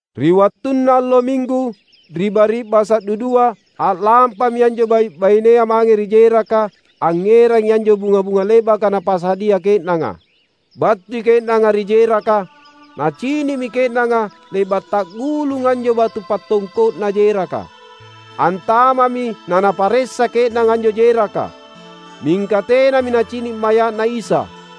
Ri wattunna allo Minggu, ri bari’basa’ dudua, a’lampami anjo bai’-bainea mange ri jeraka angngerangi anjo bunga-bunga le’baka napasadia ke’nanga. Battui ke’nanga ri jeraka, nacini’mi ke’nanga le’ba’ ta’gulung anjo batu pattongko’na jeraka. Antama’mi na naparessa ke’nanga anjo jeraka, mingka tenami nacini’ maya’Na Isa.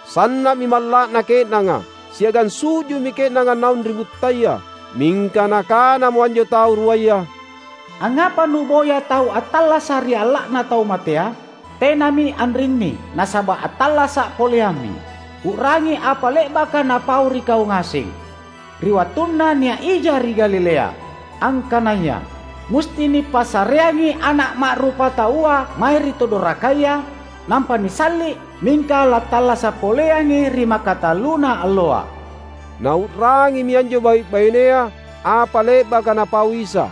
Sanna’mi malla’na ke’nanga, siagang su’ju’mi ke’nanga naung ri buttaya. Mingka nakanamo anjo tau ruaya, "Angngapa nu’boya tau attallasa’ ri alla’na tau matea? Tenami anrinni, nasaba’ attallasa’ poleammi! U’rangi apa le’baka Napau ri kau ngaseng, ri wattunna nia’ ija ri Galilea, angkanaya, ‘Musti nipassareangi Ana’ Ma’rupataua mae ri tu dorakaya, nampa nisalli’, mingka lattallasa’ poleangi ri makatalluna alloa.’" Nau’rangimi anjo bai’-bainea apa le’baka Napau Isa.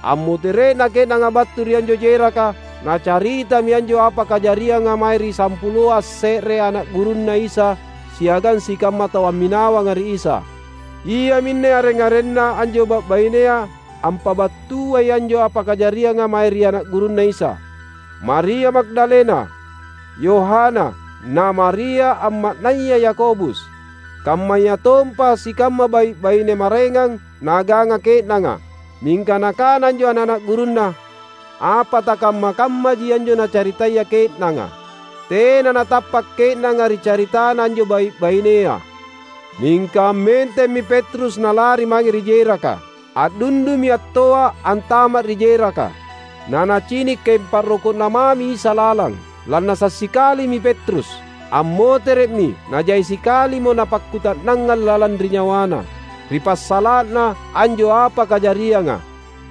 Ammotere’na ke’nanga battu ri anjo jeraka, nacaritami anjo apa kajarianga mae ri sampuloa asse’re ana’ gurunNa Isa siagang sikamma tau amminawanga ri Isa. Iaminne areng-arenna anjo bai’-bainea ampabattuai anjo apa kajarianga mae ri ana’ gurunNa Isa: Maria Magdalena, Yohana, na Maria amma’naya Yakobus, kammayatompa sikamma bai’-baine maraengang naaganga ke’nanga. Mingka nakana anjo ana’-ana’ gurunNa, apa takamma-kammaji anjo nacaritaya ke’nanga. Tena natappa’ ke’nanga ri caritana anjo bai’-bainea. Mingka ammentemmi Petrus nalari mange ri jeraka. A’dundumi attoa’ antama’ ri jeraka, nanacini’ kaeng pa’roko’na mami Isa lalang. Lannasa’ sikalimi Petrus. Ammotere’mi, najai sikalimo napakkuta’nangang lalang ri nyawana, ri passala’na anjo apa kajarianga.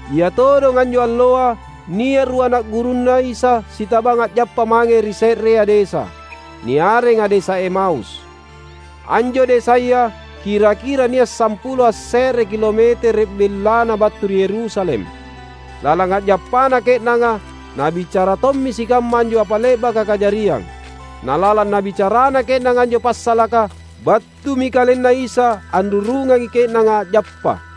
Ia todong anjo alloa, nia’ rua ana’ gurunNa Isa sitabang a’jappa mange ri se’rea desa, niarenga desa Emaus. Anjo desaya kira-kira nia’ sampulo asse’re kilometere’ bellana battu ri Yerusalem. Lalang a’jappana ke’nanga, nabicara tommi sikamma anjo apa le’baka kajariang. Na lalang nabicarana ke’nanga anjo passalaka, battumi KalenNa Isa anrurungangi ke’nanga a’jappa.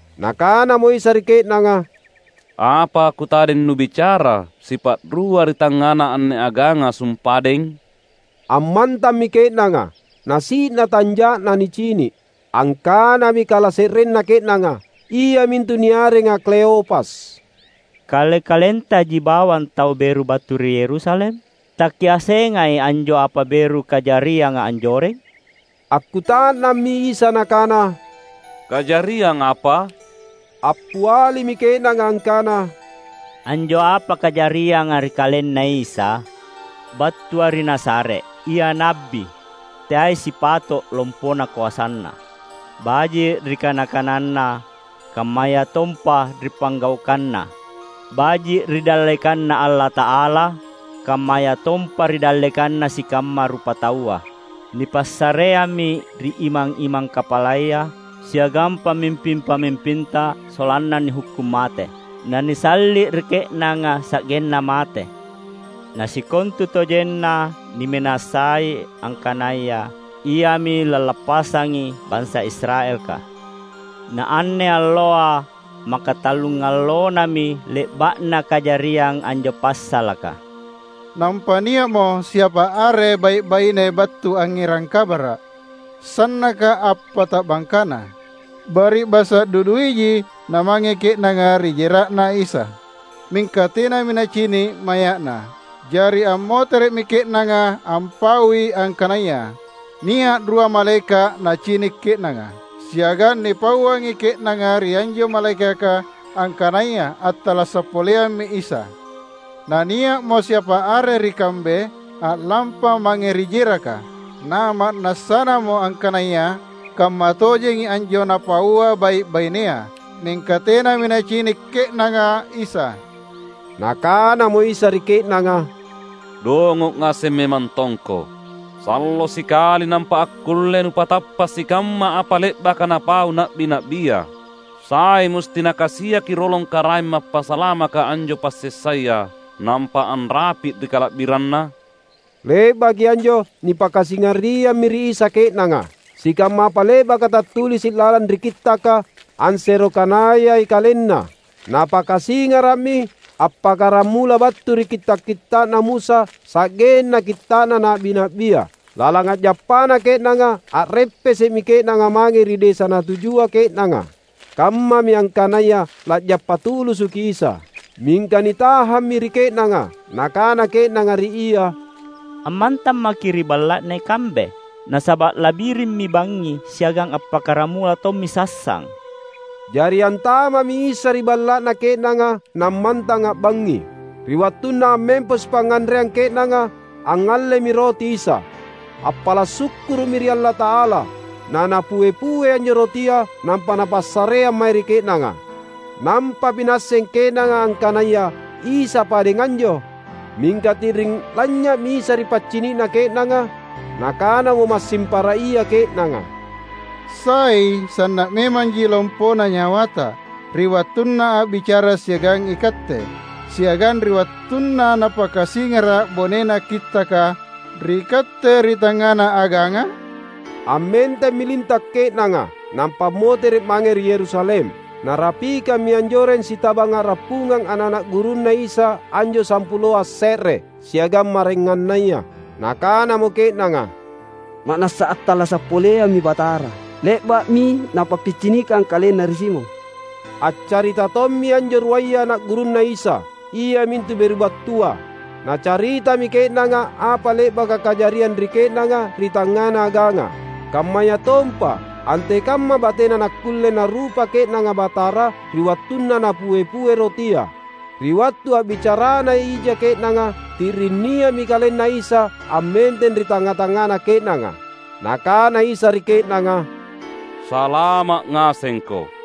Nakanamo Isa ri ke’nanga, "Apa kutadeng nubicara sipa’rua ri tangngana anne aganga sumpadeng?" Ammantammi ke’nanga, na si’na tanja’na nicini’. Angkanami kalase’renna ke’nanga, iamintu niarenga Kleopas, "Kale-kalentaji bawang tau beru battu ri Yerusalem? Takiassengai anjo apa beru kajarianga anjoreng?" Akkuta’nammi Isa Nakana, "Kajariang apa?" Appialimi ke’nanga angkana, "Anjo apa kajarianga ri KalenNa Isa, battua ri Nazaret. Ia na’bi. Teai sipato’ lompona koasaNa, baji’ ri kana-kananNa, kammayatompa ri panggaukanNa — baji’ ri dallekanNa Allata’ala, kammayatompa ri dallekanna sikamma rupataua. Nipassareammi ri imang-imang kapalaya siagang pamimping-pamimpinta sollanna nihukkung mate, na nisalli’ ri ke’nanga sa’genna mate! Na sikontutojenna niminasai angkanaya Iami lallappassangi bansa Israelka. Na anne alloa makatallungallonami le’ba’na kajariang anjo passalaka. Nampa nia’mo siapa are bai’-baine battu angngerang kabara’, sannaka appata’bangkana. Bari’basa’ duduiji namange ke’nanga ri jera’Na Isa. Mingka tenami nacini’ maya’Na. Jari ammotere’mi ke’nanga ampaui angkanaya, nia’ rua malaeka’ nacini’ ke’nanga, siagang nipauangi ke’nanga ri anjo malaekaka angkanaya attallasa’ poleammi Isa. Na nia’mo siapa are ri kambe a’lampa mange ri jeraka, na ma’nassanamo angkanaya kammatojengi anjo napaua bai’-bainea; mingka tenami nacini’ ke’nanga Isa." Nakanamo Isa ri ke’nanga, "Dongo’ ngaseng memang tongko! Sallo sikali nampa akkulle nupatappa’ sikamma apa le’baka napau na’bi-na’bia! Sai musti Nakasiaki rolong Karaeng Mappasalamaka anjo passessaya, nampa anrapi’ ri kala’biranNa?" Le’baki anjo nipakasingariammi ri Isa ke’nanga, sikamma apa le’baka tattulisi’ lalang ri Kittaka, ansero kanayai KalenNa. Napakasingara’mi appakkaramula battu ri kitta’-kitta’na Musa sa’genna kitta’na na’bi-na’bia. Lalang a’jappana ke’nanga, a’reppese’mi ke’nanga mange ri desa natujua ke’nanga. Kammami angkanaya la’jappa tulusuki Isa, mingka nitahammi ri ke’nanga. Nakana ke’nanga ri Ia, "Ammantang maKi’ ri balla’na ikambe, nasaba’ la’birimmi bangngi siagang appakkaramula tommi sassang." Jari antama’mi Isa ri balla’na ke’nanga nammantang a’bangngi. Ri wattunna ammempo sipangnganreang ke’nanga, angngallemi roti Isa. Appala’ sukkuru’mi ri Allata’ala, naNapue-pue anjo rotia, nampa Napassareang mae ri ke’nanga. Nampami naasseng ke’nanga angkanaya Isa padeng anjo. Mingka ti’ring lanynya’mi Isa ri paccini’na ke’nanga. Nakanamo massing para ia ke’nanga, "Sai sanna’ memanji lompona nyawata, ri wattunna a’bicara siagang ikatte, siagang ri wattunna Napakasingara’ bonena Kittaka ri katte ri tangngana aganga?" Ammentemmi linta’ ke’nanga, nampa ammotere’ mange ri Yerusalem. Narapikammi anjoreng sitabang a’rappungang ana’-ana’ gurunNa Isa anjo sampuloa asse’re, siagang maraengannaya. Nakanamo ke’nanga, "Ma’nassa attallasa’ poleammi Batara! Le’ba’mi Napappicinikang KalenNa ri Simon!" Accarita tommi anjo ruaya ana’ gurunNa Isa, iamintu beru battua. Nacaritami ke’nanga apa le’baka kajariang ri ke’nanga ri tangngana aganga, kammayatompa antekamma batena nakkulle narupa ke’nanga Batara, ri wattunna Napue-pue rotia. Ri wattu a’bicarana ija ke’nanga, ti’ring nia’mi KalenNa Isa ammenteng ri tangnga-tangngana ke’nanga. Nakana Isa ri ke’nanga, "Salama’ ngasengko!"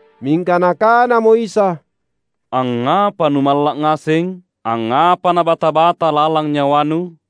Mingka Nakanamo Isa, "Angngapa numalla’ ngaseng? Angngapa nabata-bata lalang nyawanu?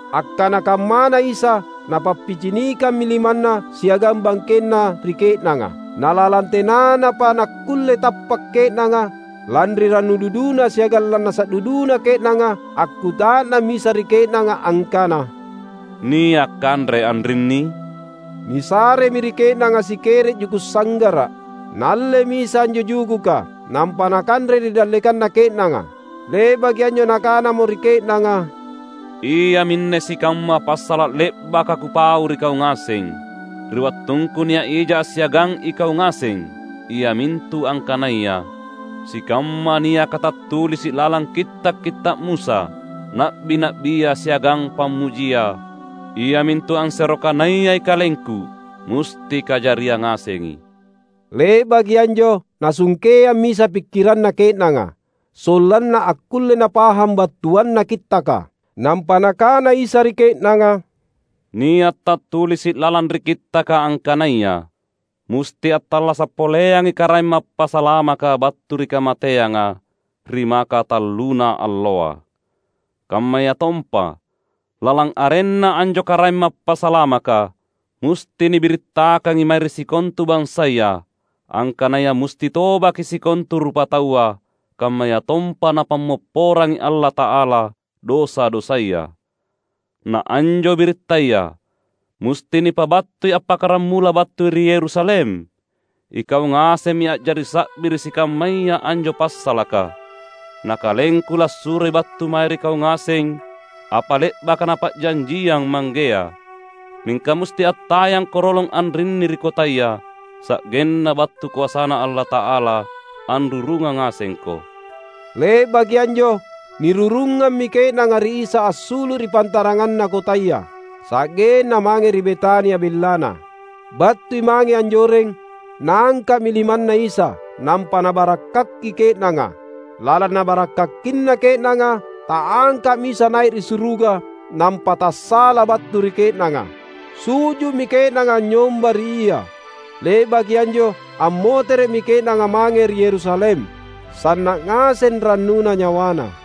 Akkana kammana Isa, Napappicinikammi limanNa siagang bangkenNa ri ke’nanga. Na lalang tenanapa nakkulle tappa’ ke’nanga, lanri rannu duduna siagang lannasa’ duduna ke’nanga, akkuta’nammi Isa ri ke’nanga angkana, "Nia’ kanre anrinni?" Nisaremi ri ke’nanga sikere’ juku’ sanggara’. Naallemi Isa anjo jujuka, nampa Nakanre ri dallekanna ke’nanga. Le’baki anjo Nakanamo ri ke’nanga, "Iaminne sikamma passala’ le’baka Kupau ri kau ngaseng, ri wattungKu nia’ija assiagang ikau ngaseng. Iamintu angkanaya: sikamma niaka tattulisi’ lalang Kitta’-kitta’ Musa, Na’bi-na’bia, siagang Pammujia, iamintu ansero kanayai KalengKu, musti kajariang ngasengi." Le’baki anjo Nasungkeammi Isa pikkiranna ke’nanga, sollanna akkulle napahang battuanna Kittaka. Nampa Nakana Isa ri ke’nanga, "Nia’ tattulisi’ lalang ri Kittaka angkanaya musti attallasa’ poleangi Karaeng Mappasalamaka battu ri kamateanga, ri makatalluna alloa. Kammayatompa, lalang arenNa anjo Karaeng Mappasalamaka, musti nibirittakangi mae ri sikontu bansaya angkanaya musti tobaki sikontu rupataua, kammayatompa Napammopporangi Allata’ala dosa-dosaya. Na anjo birittaya, musti nipabattui appakkaramula battu ri Yerusalem. Ikau ngasemmi a’jari sa’bi ri sikammaya anjo passalaka. Na KalengKu lassuroi battu mae ri kau ngaseng apa le’baka Napa’janjiang Manggea. Mingka musti attayangko rolong anrinni ri kotaya, sa’genna battu koasaNa Allata’ala anrurungang ngasengko." Le’baki anjo, nirurungammi ke’nanga ri Isa assulu’ ri pantaranganna kotaya, sa’genna mange ri Betania bellana. Battui mange anjoreng, Naangka’mi limanNa Isa, nampa Nabarakkaki ke’nanga. Lalang Nabarakkakina ke’nanga, ta’angka’mi Isa nai’ ri suruga, nampa tassa’la’ battu ri ke’nanga. Su’ju’mi ke’nanga anynyomba ri Ia. Le’baki anjo ammotere’mi ke’nanga mange ri Yerusalem, sanna’ ngaseng rannuna nyawana,